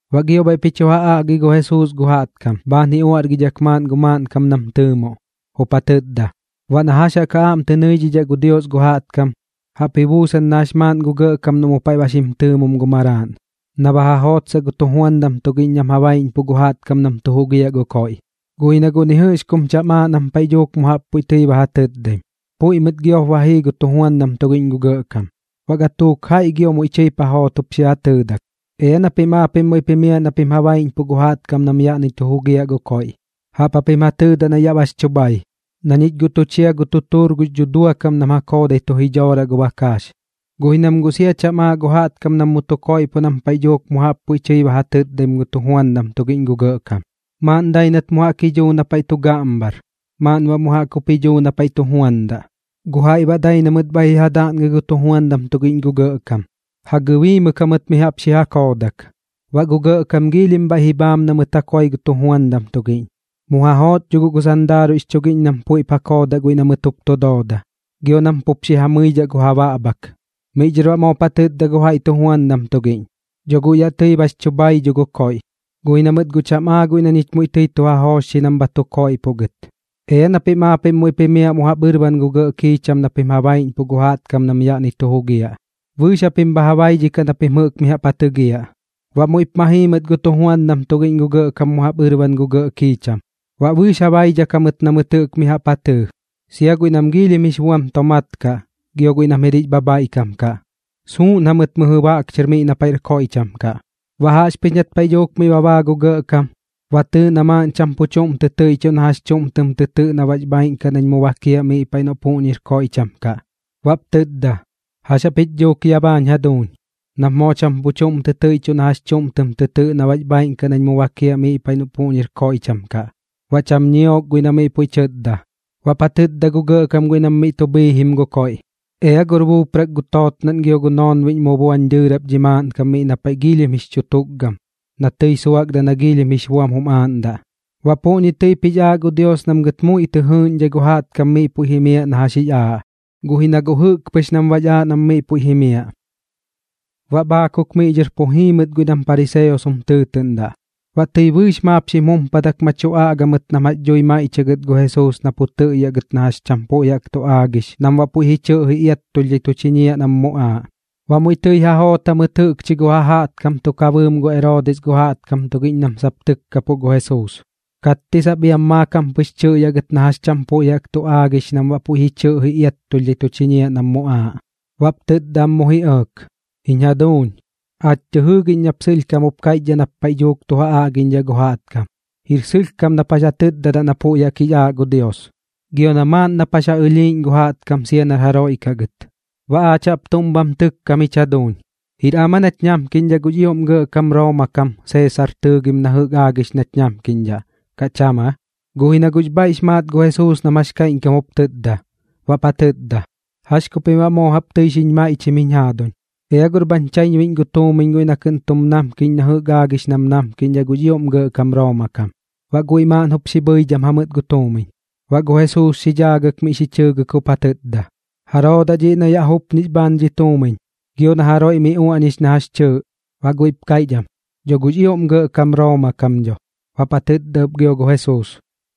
Baꞌ gio bhaiꞌp ji chu ja aꞌgi gu Jesuus gu jaꞌtkam bhaan ji uaꞌrgidhak maaꞌn gu maaꞌnkam nam tɨɨmoꞌ, jup ja tɨtda: ―Baꞌ na jax jaꞌk ja aꞌm tɨ nɨidhidhaꞌ gu Dios gu jaꞌtkam, jaꞌp ji buusan na jax maaꞌn gu gɇꞌkam noꞌ mu paiꞌ ba xim tɨɨmom gu maraaꞌn, na ba ja jootsaꞌ gu tujuandam tugiꞌñ nam ja baiꞌñpuꞌ gu jaꞌtkam nam tu jugiaꞌ gu koiꞌ. Guꞌ ji na guꞌ ni jɨꞌx kum cham aaꞌ nam paiꞌ dhuuk mu jaꞌp puiꞌ tɨi ba ja tɨtdaim, puiꞌ mɨt giop ba jii gu tujuandam tugiꞌñ gu gɇꞌkam. Baꞌ gatuuk jaiꞌ gio muiꞌ tɨip ja joot jup xi ja tɨɨdak: “Ea na pim aapiꞌm muiꞌp jimiaꞌ na pim ja baiꞌñpuꞌ gu jaꞌtkam nam yaꞌni tu jugiaꞌ gu koiꞌ. Jaꞌp japim ja tɨɨdaꞌ na yaꞌ bax chu bhai, na ñich guꞌ tu chia gu tutuur gux dhudua kam nam ja koodai tu jidhooraꞌ gu bakaax.” Guꞌ ji na mɨt guꞌ sia cham aa gu jaꞌtkam nam mu tu koiꞌpoꞌ nam paiꞌ dhuuk mu jaꞌp puiꞌ tɨi ba ja tɨtdaim gu tujuandam tugiꞌñ gu gɇꞌkam. Maaꞌn dai nat mu jaꞌk ji dhuu na paiꞌ tu gaꞌmbhar, maaꞌn baꞌ mu jaꞌk jup ji dhuu na paiꞌ tu juandaꞌ. Gu jaiꞌ baꞌ dai na mɨt bhaiꞌ ji ja daꞌngɨ gu tujuandam tugiꞌñ gu gɇꞌkam, ja gɨbiimɨk jamɨt mi jaꞌp xi ja koodak. Baꞌ gu gɇꞌkam giilhim bhaiꞌ ji bhaam na mɨt ja koi gu tujuandam tugiꞌñ. Mu ja joot dho guꞌ gu sandaaruiꞌx chugiꞌñ nam puiꞌp ja koodaꞌ guiꞌ na mɨt jup tu dooda, gio nam pup xi ja mɨmɨidhaꞌ gu ja baꞌbhak. Miꞌ dhɨr baꞌ moop ja tɨtda gu jaiꞌ tujuandam tugiꞌñ: “Dho guꞌ yaꞌ tɨi bax chu bhai dho dhi koiꞌ, guꞌ ji na mɨt guꞌ cham aa guiꞌ na ñich muiꞌ tɨi tu ja joochxi nam bha tu koiꞌpoꞌ gɨt. Ea na pim aapiꞌm muiꞌp jimiaꞌ mu jaꞌp ɨrban gu gɇꞌ kiicham na pim ja baiꞌñpuꞌ gu jaꞌtkam nam yaꞌni tu jugiaꞌ. Bɨɨx japim bha ja baidhikaꞌ na pim jɨꞌk mi jaꞌp ja tɨgiaꞌ.” Baꞌ muiꞌp ma jii mɨt gu tujuandam tugiꞌñ gu gɇꞌkam mu jaꞌp ɨrban gu gɇꞌ kiicham, baꞌ bɨɨx ja baidhak jamɨt na mɨt jɨꞌk mi jaꞌp ja tɨɨ, sia guiꞌ nam giilhim jix buam tomaat kaꞌ gio guiꞌ nam jir jix bhabhaiꞌkam kaꞌ. Suuꞌn jamɨt mɨjɨ baꞌk chɨr miꞌ na paiꞌr koiꞌcham kaꞌ. ’Baꞌ jaꞌxpɨx nat paiꞌ dhuuk miꞌ ba baa gu gɇꞌkam, ba tɨɨ na maaꞌn cham pu chuꞌm tɨ tɨiꞌchuꞌ na jax chuꞌm tɨm tɨtɨꞌ na baꞌx bhaaiꞌn kaꞌ nañ mu bakiaꞌ miꞌ paiꞌ noꞌ puꞌñir koiꞌcham kaꞌ. Baꞌp tɨtda: “¿Jax japich dhuuk ya baañ jaduuñ? Nap moo cham pu chuꞌm tɨ tɨiꞌchuꞌ na jax chuꞌm tɨm tɨtɨꞌ na baꞌx bhaaiꞌn kaꞌ nañ mu bakiaꞌ miꞌ paiꞌ noꞌ puꞌñir koiꞌcham kaꞌ.” Baꞌ cham ñiok guiꞌ na miꞌ puiꞌ tɨtda. Baꞌp ja tɨtda gu gɇꞌkam guiꞌ nam miꞌ tu bhiijim gu koiꞌ: “Ea gor buuprak gu tootnaꞌn gio gu noonbiꞌñ mu buañ dɨɨrap dhi maaꞌnkam miꞌ na paiꞌ giilhim jix chukgam na tɨi suakdaꞌ na giilhim jix buam jum aaꞌndaꞌ.” Baꞌ puꞌñi tɨip jix aaꞌ gu Dios nam gɨt muiꞌ tɨ jɨɨꞌñdhai gu jaꞌtkam miꞌ puiꞌ jimiaꞌ na jax jix aaꞌ, guꞌ ji na guꞌ jɨꞌk pɨx nam baꞌx aaꞌ nam miꞌ puiꞌ jimiaꞌ. Baꞌ bhaakuk miꞌ dhɨr pu jii mɨt guiꞌ nam pariseos jum tɨɨtɨꞌndaꞌ. Baꞌ tɨi bɨɨx maap xim jumpadak ma tu aꞌga mɨt nam jax dhui maiꞌchiaꞌ gɨt gu Jesuus na pu tɨꞌyaꞌ gɨt na jax cham puiꞌ jaꞌk tu aagix kaꞌ nam baꞌ puiꞌ ji chɨꞌji iattulhdhai tu chiñiaꞌ nam muꞌaaꞌ. Baꞌ muiꞌ tɨi ja joot jamɨt jɨꞌkchi gu ja jaꞌtkam tuk ja bɨɨm gu Eroodis gu jaꞌtkam tugiꞌñ nam sap tɨkkapuꞌ gu Jesuus, katti sap iam maakam pɨx tɨꞌyaꞌ gɨt na jax cham puiꞌ jaꞌk tu aagix kaꞌ nam baꞌ puiꞌ ji chɨꞌji iattulhdhai tu chiñiaꞌ nam muꞌaaꞌ. Baꞌp tɨtda am mu ji ɇɇk: ―Jiñ jaduuñ, aach tɨ jɨɨgiꞌñ nap sɨlhkam jup kaiꞌchdhaꞌ nap paiꞌ dhuuk tu ja aꞌgiꞌñdhaꞌ gu jaꞌtkam, jir sɨlhkam nap jax ja tɨtdadaꞌ na puiꞌ jaꞌk jix aaꞌ gu Dios, gio na maaꞌn nap jax ja ɨlhiiꞌñ gu jaꞌtkam sia nar jaroiꞌ kaꞌ gɨt. Baꞌ aach jaꞌp tuꞌm bham tɨkkam jich jaduuñ, ¿jir am aa nach namkiꞌñdhaꞌ gux ioꞌm gɇꞌkam Rooma kam Seesar tɨɨgim na jɨꞌk aagix nach namkiꞌñdhaꞌ, kaꞌ cham aa? Guꞌ ji na guꞌx bhaiꞌx maat gu Jesuus nam jax kaiꞌñkam jup tɨtda, baꞌp ja tɨtda: ―¿Jax ku pim baꞌ moo jaꞌp tɨi xiñ maiꞌchim jiñ jaaduñ? Ea gor maaꞌn bhañ chaiñbuiꞌñ gu tuumiñ guiꞌ na kɨꞌn tum namkiꞌñ na jɨꞌk aagix nam namkiꞌñdhaꞌ gux ioꞌm gɇꞌkam Rooma kam. Baꞌ guiꞌ maaꞌn jup xi bhɨidham jamɨt gu tuumiñ. Baꞌ gu Jesuus xi dhaagɨk miꞌ xi chɨɨgɨk jup ja tɨtda: ―¿Jaroo daꞌ dhiꞌ na yaꞌ jupñix bhaan dhi tuumiñ, gio na jaroiꞌ miꞌ uaꞌñix na jax chɨɨꞌ? Baꞌ guiꞌp kaiꞌch am: ―Dho gux ioꞌm gɇꞌkam Rooma kam dho. Baꞌp ja tɨtda ɨp gio gu Jesuus: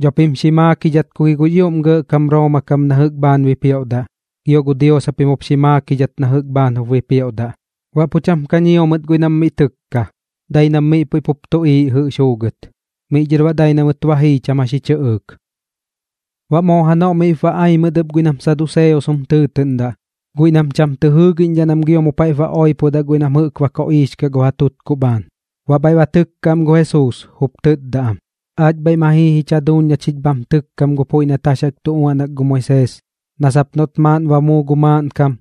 ―Dho pim xi maakidhat ku gi gux ioꞌm gɇꞌkam Rooma kam na jɨꞌk bhaan jup bipioꞌdaꞌ, gio gu Dios japim jup xi maakidhat na jɨꞌk bhaan jup bipioꞌdaꞌ. Baꞌ pu cham ka ñio mɨt guiꞌ nam miꞌ tɨkka, dai nam miꞌ puiꞌ pup tuꞌiiꞌ jɨꞌx juugɨt. Miꞌ dhɨr baꞌ dai na mɨt ba jii cham jax ji chɨꞌɨɨk. Baꞌ moo janoꞌ miꞌp ba ai mɨt ɨp guiꞌ nam saduseos jum tɨɨtɨꞌndaꞌ, guiꞌ nam cham tɨ jɨɨgiꞌñdhaꞌ nam gio mu paiꞌp ba oipodaꞌ guiꞌ nam jɨꞌk ba koꞌiix kaꞌ gu ja tutkuꞌ am bhaan. Baꞌ bhaiꞌ ba tɨkka am gu Jesuus, jup tɨtda am: ―Aach bhaiꞌ ma jii jich jaduuñ na chich bham tɨkkam gu puiꞌ nat jax jaꞌk tu uaꞌnak gu Moisees, na sap noꞌt maaꞌn ba muu gu maaꞌnkam,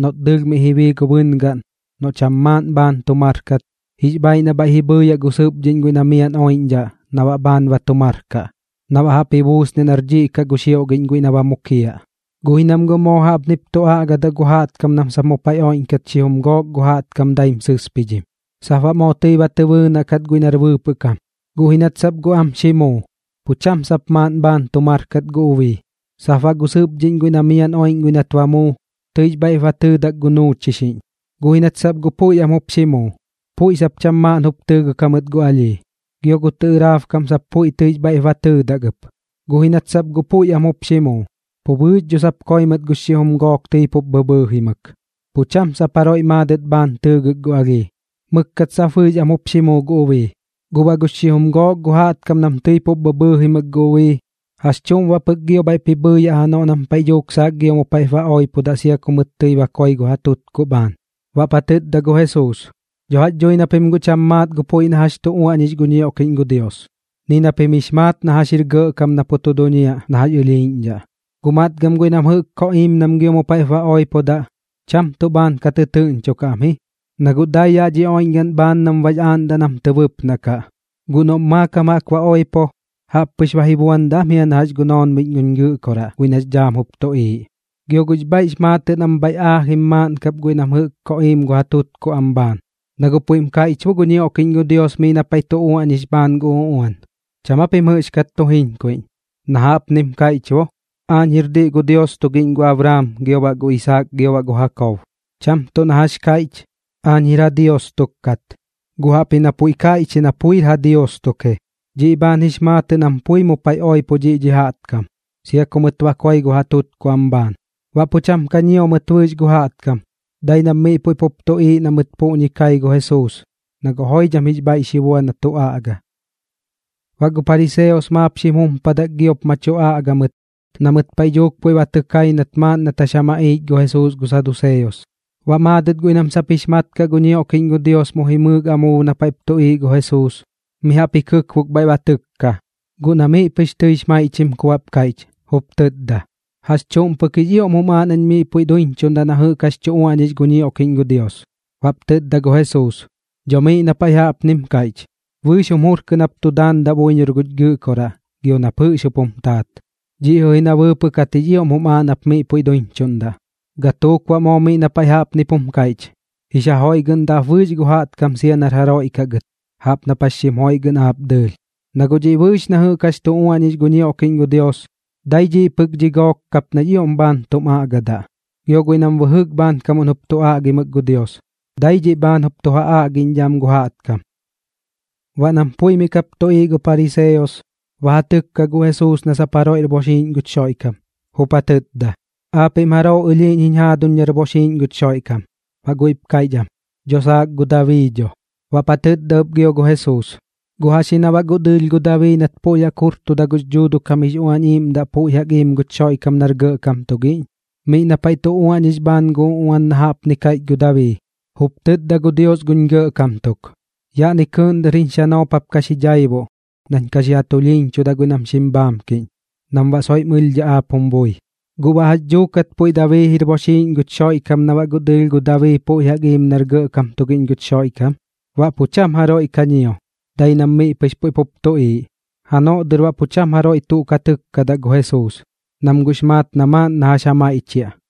noꞌt dɨɨlh miꞌ ji bii gu bɨngaꞌn, noꞌ cham maaꞌn bhaan tu mar kat, jix bhaiꞌ na bhaiꞌ ji bhɨɨyaꞌ gu sɨpdhiꞌñ guiꞌ na miaꞌn oiꞌñdhaꞌ na baꞌ bhaan ba tu mar kaꞌ, na baꞌ jaꞌp ji buusniaꞌ nar dhiꞌ kaꞌ gu xioꞌgiꞌñ guiꞌ na ba mukiaꞌ. Guꞌ ji nam guꞌ moo jaꞌpnip tu aꞌgadaꞌ gu jaꞌtkam nam sap mu paiꞌ oiꞌñkat xijum gook gu jaꞌtkam daim sɨspidhim. Sap baꞌ moo tɨi ba tɨ bɨɨnaꞌ kat guiꞌ nar bɨɨpɨꞌ kam, guꞌ ji nat sap guꞌ am xi muu, pu cham sap maaꞌn bhaan tu mar kat gu ubii. Sap baꞌ gu sɨpdhiꞌñ guiꞌ na miaꞌn oiꞌñ guiꞌ nat ba muu, tɨix bhaiꞌ ba tɨɨdak gu nuuchixiꞌñ. Guꞌ ji nat sap guꞌ puiꞌ am jup xi muu, puiꞌ sap cham maaꞌn jup tɨɨgɨk jamɨt gu alhii. Gio gu tɨꞌɨraab kam sap puiꞌ tɨix bhaiꞌp ba tɨɨdak ɨp, guꞌ ji nat sap guꞌ puiꞌ am jup xi muu. Pu bɨɨx dho sap koi mɨt gu xijum gook tɨi pup bhɨbhɨɨjimɨk, pu cham sap jaroiꞌ maadɨt bhaan tɨɨgɨk gu alhii. Mɨkkat sap bɨɨx am jup xi muu gu ubii. Guꞌ baꞌ gu xijum gook gu jaꞌtkam nam tɨi pup bhɨbhɨɨjimɨk gu ubii, ¿jax chuꞌm baꞌ pɨk gio bhaiꞌp ji bhɨɨyaꞌ janoꞌ nam paiꞌ dhuuk saak gio mu paiꞌp ba oipodaꞌ sia ku mɨt tɨi ba koi gu ja tutkuꞌ am bhaan? Baꞌp ja tɨtda gu Jesuus: ―Dho jax dhui na pim guꞌ cham maat gu puiꞌ na jax tu uaꞌñix gu ñioꞌkiꞌñ gu Dios, ni na pim jix maat na jax jir gɇꞌkam na pu tu duñiaꞌ na jax ɨlhiiꞌñdhaꞌ. Guꞌ matgɨm guiꞌ nam jɨꞌk koꞌiim nam gio mu paiꞌp ba oipodaꞌ, cham tuꞌ bhaan ka tɨtɨɨꞌñchokaꞌ am ji, na guꞌ dai yaꞌ dhi oiꞌñgaꞌn bhaan nam baꞌx aaꞌndaꞌ nam tɨ bɨpnaꞌ kaꞌ. Guꞌ noꞌm maakam jaꞌk ba oipo, jaꞌppɨx ba ji buandaꞌ am ji na jax gu noonbiꞌñ guñ Gɨꞌkoraꞌ guiꞌ nax dhaam jup tuꞌiiꞌ. Gio guꞌx bhaiꞌx maatɨꞌ nam bhaiꞌ paiꞌ aajim maaꞌn kap guiꞌ nam jɨꞌk koꞌiim gu ja tutkuꞌ am bhaan, na guꞌ puiꞌm kaiꞌch bo gu ñioꞌkiꞌñ gu Dios miꞌ na paiꞌ tu uaꞌñix bhaan gu uꞌuan. ¿Cham aa pim jɨꞌxkat tu jiñkuiꞌñ? Na jaꞌpnim kaiꞌch bo: “Aañ jir diꞌ gu Dios tugiꞌñ gu Abraam, gio baꞌ gu Isaak, gio baꞌ gu Jakob.” Cham tuꞌ na jax kaiꞌch: “Aañ jir ja Dios tuk kat”, guꞌ jaꞌpji na puiꞌm kaiꞌch ji na puir ja Dios tuk ji. Dhiꞌ bhaan jix maatɨꞌ nam pui mu paiꞌ oipo dhiꞌ dhi jaꞌtkam, sia ku mɨt ba koi gu ja tutkuꞌ am bhaan. Baꞌ pu cham ka ñio mɨt bɨɨx gu jaꞌtkam, dai nam miꞌ puiꞌ pup tuꞌiiꞌ na mɨt puꞌñi kai gu Jesuus, na guꞌ joidham jix bhaiꞌ xi bua na tu aꞌga. Baꞌ gu pariseos maap xim jumpadak giop ma tu aꞌga mɨt na mɨt paiꞌ dhuuk puiꞌ ba tɨ kai nat maaꞌn nat jax ja maꞌiich gu Jesuus gu saduseos. Baꞌ maadɨt guiꞌ nam sap jix mat kaꞌ gu ñioꞌkiꞌñ gu Dios mu jimɨɨk amuub na paiꞌp tuꞌiiꞌ gu Jesuus, mi jaꞌp ji kɨkbok bhaiꞌ ba tɨkka, guꞌ na miꞌ pɨx tɨix maiꞌchim ku baꞌp kaiꞌch, jup tɨtda: ―¿Jax chuꞌm pɨk jix ioꞌm jum aaꞌ nañ miꞌ puiꞌ duiñchuꞌndaꞌ na jɨꞌk jax tu uaꞌñix gu ñioꞌkiꞌñ gu Dios? Baꞌp tɨtda gu Jesuus: ―Dho miꞌ na paiꞌ jaꞌpnim kaiꞌch: “Bɨɨx jum jur kɨꞌn jap tu daandaꞌ buiñor guch Gɨꞌkoraꞌ, gio nap jɨꞌx jup jum taat.” Dhiꞌ jɨꞌ ji na bɨɨpɨꞌ kat jix ioꞌm jum aaꞌ nap miꞌ puiꞌ duiñchuꞌndaꞌ. Gatuuk baꞌ moo miꞌ na paiꞌ jaꞌpnip jum kaiꞌch: “Jix ja joiꞌgɨꞌndaꞌ ap bɨɨx gu jaꞌtkam sia nar jaroiꞌ kaꞌ gɨt, jaꞌp nap jax xim joiꞌgɨꞌndaꞌ aap dɨɨlh.” Na guꞌ dhiꞌ bɨɨx na jɨꞌk jax tu uaꞌñix gu ñioꞌkiꞌñ gu Dios, dai dhiꞌ pɨk dhi gok kap nax ioꞌm bhaan tum aꞌgadaꞌ, gio guiꞌ nam bɨjɨk bhaankam jup tu aꞌgimɨk gu Dios, dai dhiꞌ bhaan jup tu ja aꞌgiꞌñdhaꞌ am gu jaꞌtkam. Baꞌ nam pui miꞌ kap tuꞌiiꞌ gu pariseos, ba ja tɨkka gu Jesuus na sap jaroiꞌr boxiiꞌñ guch Xoiꞌkam, jup ja tɨtda: ―¿Aapiꞌm jaroo ɨlhiiꞌñ jiñ jaaduñ nar boxiiꞌñ guch Xoiꞌkam? Baꞌ guiꞌp kaiꞌch am: ―Dho saak gu Dabii dho. Baꞌp ja tɨtda ɨp gio gu Jesuus: ―¿Guꞌ jax ji na baꞌ guꞌ dɨɨlh gu Dabii nat puiꞌ jaꞌk jurtuda gux Dhuuduꞌ kam jix Uañ Iiꞌmdaꞌ puiꞌ jaꞌk iim guch Xoiꞌkam nar gɇꞌkam tugiꞌñ? Miꞌ paiꞌ na tu uaꞌñix bhaan gu uꞌuan na jaꞌpni kaiꞌch gu Dabii: Jup tɨtda gu Dios guñ gɇꞌkam tuk: “Yaꞌni kɨɨꞌn dɨr jiñ xanoop jap ka xi dhaibuꞌ nañ ka xi ja tulhiiñchudaꞌ guiꞌ nam xim bhaamkiꞌñ, nam baꞌ soiꞌ bam ɨlhdhaꞌ aap jum bui.” ¿Guꞌ baꞌ jax dhuukat puiꞌ Dabii jir boxiiꞌñ ji guch Xoiꞌkam na baꞌ guꞌ dɨɨlh gu Dabii puiꞌ jaꞌk iim nar gɇꞌkam tugiꞌñ guch Xoiꞌkam? Baꞌ pu cham jaroiꞌ ka ñio, dai nam miꞌ pɨx puiꞌ pup tuꞌiiꞌ. Janoꞌ dɨr baꞌ pu cham jaroiꞌ tuꞌ ka tɨkkadaꞌ gu Jesuus, nam guꞌx maat na maaꞌn na jax ja maiꞌchiaꞌ.